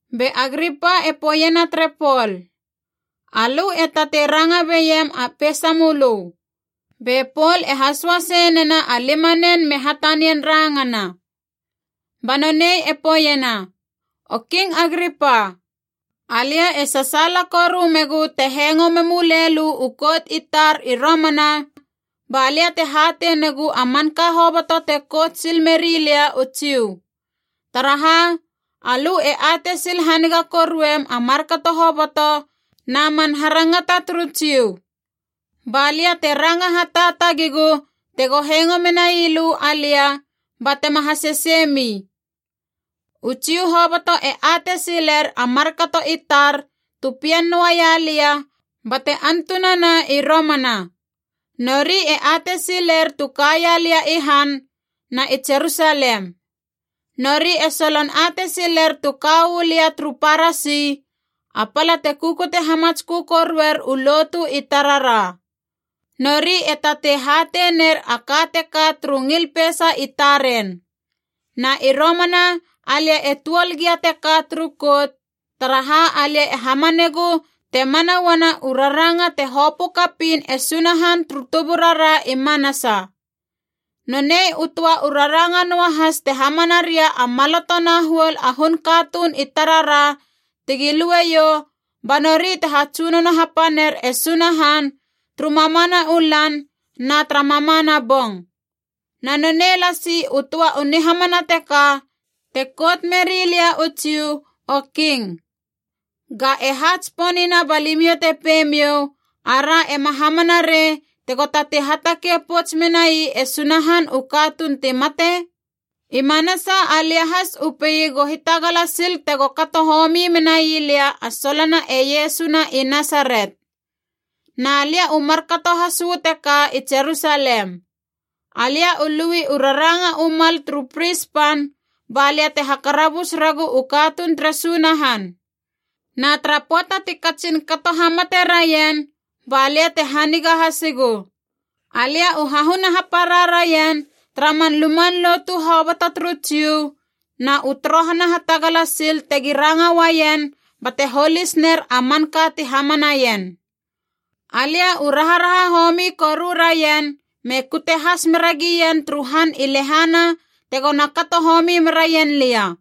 Be Agripa e poeiena tere Pol, “Alö e tatei ranga beiem a peisamölö.” Be Pol e hasoasei nena a limanen me hatanian rangana. Ba nonei e poeiena, “O King Agripa. Alia e sasaala koru megu te hengo memulei lö u kout i tar i romana balia te hatei negu a manka hoboto te kout sil meri lia u Jiu. Taraha, alö e atei sil haniga koruem a markato hoboto na man harangata turu Jiu. Balia te ranga hataatagigu tego hengo menai lö alia ba tema haseseimi. “U Jiu hoboto e atei siler a markato i tar tu pien noaia lia bate antunana i romana. Nori e atei siler tu kaia lia i han, na i Jerusalem. Nori e solon atei siler tu ka uu lia turu Parasi, a pala te kukute hamatskö koruer u lotu i tarara. Nori e tatei hatei ner a ka teka turu ngil peisa i taren. Na i romana alia e tuol gia teka turu kout, taraha alia e hamanegu te mana uana u raranga te hopö kapiin e Sunahan turu tuburara i manasa. Nonei u töa u raranga noahas te hamana ria a maloto na huol a hun katuun i tarara tegi lueiou, ba nori te hatsunono hapaner e Sunahan turu mamana u lan na tara mamana bong. Na nonei lasi u töa u nihamana teka te kout meri lia u Jiu, o King. Ga e ha tsiponina balimiou te pei miou, ‘Ara ema hamana rei tego tatei hatakei pouts menai e Sunahan u katuun ti mate?’ “I manasa alia has u pei go hitagala sil tego kato homi menai lia a solona e Iesu na i Nasaret. Na lia u markato has uu teka i Jerusalem. Alia u lui u raranga u mal turu pris pan balia te hakarabus regu u katuun tere Sunahan. Na tara pöata ti katsin kato hamate raien balia te haniga hasigu. Alia u hahuna hapara raien tara man luman lotu hoboto turu Jiu na u torohana hatagala sil tegi ranga uaien bate holis ner a manka ti hamanaien. Alia u raharaha homi koru raien me kute has meragien turu han i lehana tegona kato homi meraien lia.”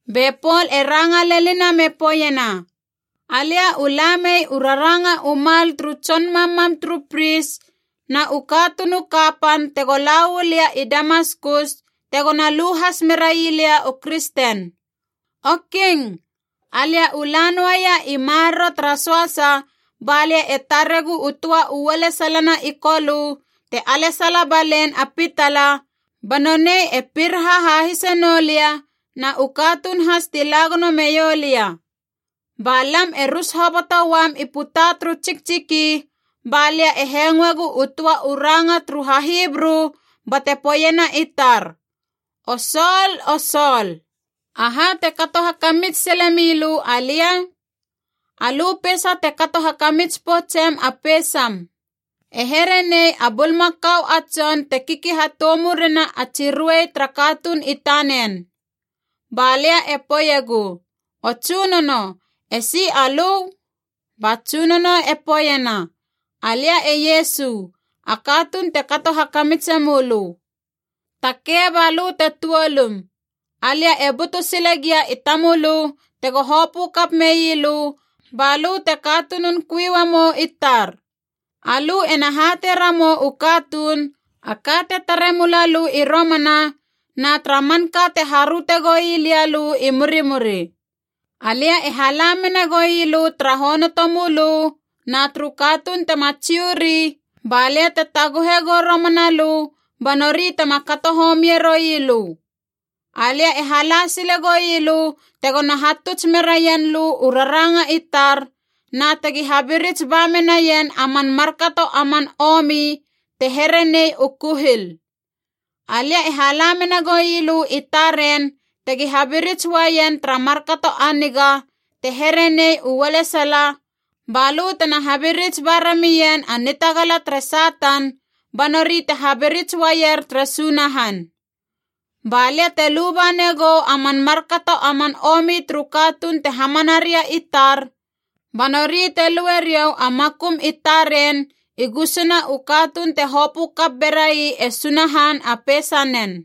Be Pol e ranga lenina me poeiena, “Alia u la mei u raranga u mal turu tson mammam turu pris na u katuun u kapan tego la uu lia i Damaskus tegona lu has merailia u kristen. O King, alia u la noaia i maroro tara söasa balia e taregu u töa u ualesalana i Kolö te alesala balein a pitala, ba nonei e piraha hahise noulia na u katuun has ti la gono meiou lia. Ba lam e rus hoboto uam i puta turu tsiktsiki, balia e hengoegu u töa u ranga turu HaHibru bate poeiena i tar, ‘O Sol, o Sol, aha te kato hakamits sile milö alia? Alö peisa te kato hakamits poutsem a peisam. E here nei a bulmakau a tson te kiki hatoumurena a tsi ruei tara katuun i tanen.’ “Ba lia e poeiegu, ‘O tsunono, esi alö?’ Ba Tsunono e poeiena, ‘Alia e Iesu, a katuun te kato hakamitse mölö. Takei, ba lö te tuolum. Alia e butu sile gia i tamölö tego hopö kap mei lö balö te katunun kui uamou i tar. Alö ena hatei ramou u katuun, a ka te tare mula lö i romana na tara manka te haröte goui lia lö i murimuri. Alia e hala mena goui lö tara honoto mölö na turu katuun tema Jiu ri, ba lia te taguhe gou romana lö ba nori tema kato homie roui lö. Alia e hala sile goui lö tegona hatuts meraien lö u raranga i tar na tegi habirits ba menaien a man markato a man omi te here nei u kuhil. Alia e hala mena goui lö i taren tegi habirits uaien tara markato a niga te here nei u ualesala, ba lö tena habirits ba ramien a nitagala tere Satan ba nori te habirits uaier tere Sunahan. Ba lia te luba negou a man markato a man omi turu katuun te hamana ria i tar, ba nori te lue riou a makum i taren i gusuna u katuun te hopö kap berai e Sunahan a peisanen.’”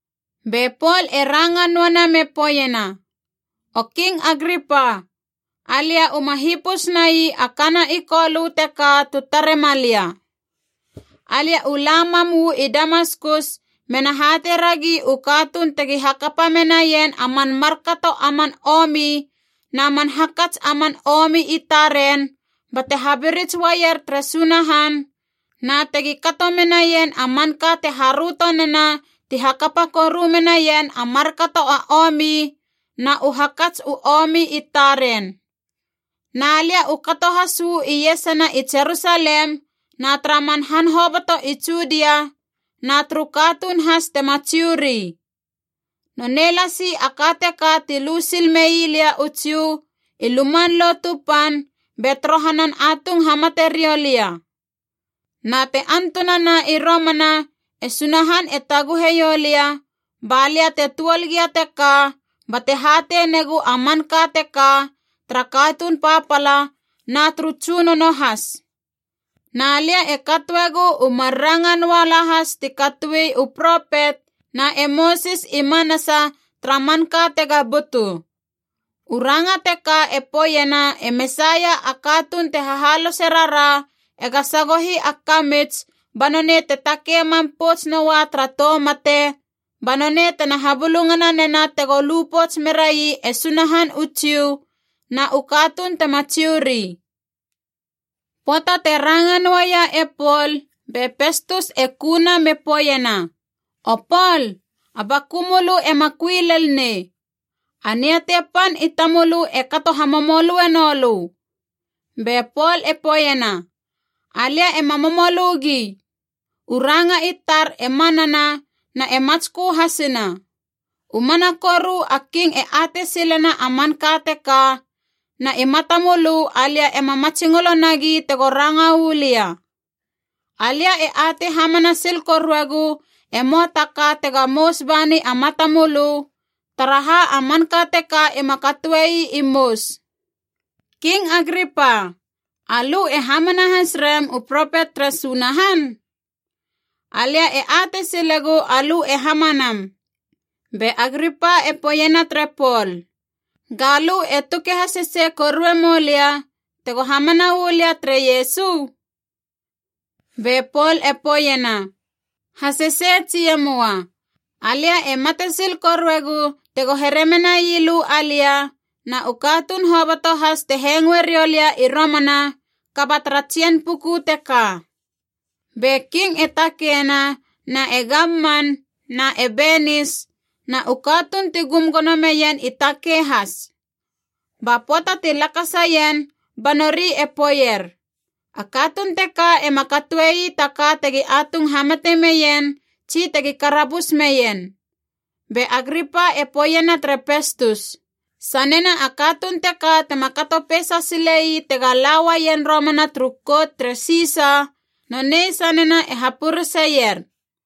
Be Pol e ranga noana me poeiena, “O King Agripa, alia uma hipus nai a kana i Kolö teka tu tare malia. Alia u la mam uu i Damaskus mena hatei ragi u katuun tegi hakapa menaien a man markato a man omi na man hakats a man omi i taren bate habirits uaier tere Sunahan, na tegi kato menaien a manka te haröto nena ti hakapa koru menaien a markato a omi na u hakats u omi i taren. Na lia u kato has uu iesana i Jerusalem na tara man han hoboto i Judia na turu katuun has tema Jiu ri. Nonei lasi a ka teka ti lu sil mei lia u Jiu i Luman Lotu Pan be torohanan atung hamate riou lia. Na te antunana i romana e Sunahan e taguhe ioulia, balia te tuol gia teka bate hatei negu a manka teka tara katuun papala na turu tsunono has. Na lia e katoegu u mar ranga noa lahas ti katoi u propet na e Mosis i manasa tara manka tega butu. U ranga teka e poeiena e Mesaia a katuun te hahalose rara ega sagohi a kamits ba nonei te takei mam pouts noa tara tou mate ba nonei tena habulungana nena tego lu pouts merai e Sunahan u Jiu na u katuun tema Jiu ri.” Pöata te ranga noaia e Pol, be Pestus e kuna me poeiena, “O Pol, a baku mölö ema kui lel nei! A niatei pan i tamölö e kato hamomolöe noulö!” Be Pol e poeiena, “Alia ema momolö gi! U ranga i tar e manana na e matskö hasina. U mana koru a King e atei silena a manka teka, na i matamölö alia ema matsingolo nagi tego ranga uu lia. Alia e atei hamana sil koruegu e möa ta ka tega mous bani a matamölö, taraha a manka teka ima katoei i mous. King Agripa, alö e hamana has rem u propet tere Sunahan? Alia e atei silegu alö e hamanam.” Be Agripa e poeiena tere Pol, “Ga lö e tuke hasesei korue moulia tego hamana uu lia tere Iesu?” Be Pol e poeiena, “Hasesei tsi e möa, alia e matesil koruegu tego here menai lö alia, na u katuun hoboto has te hengoe riou lia i romana, kaba tara tsien puku teka.” Be King e takeina na e gamman na e Benis, na u katuun ti gum gono meien i takei has. Ba pöata ti lakasaien ba nori e poeier, “A katuun teka ema katoe ii ta ka tegi atung hamate meien tsi tegi karabus meien.” Be Agripa e poeiena tere Pestus, “Sanena a katuun teka tema kato peisa sile ii tega la uaien romana turu kout tere Sisa, nonei sanena e hapureseier.”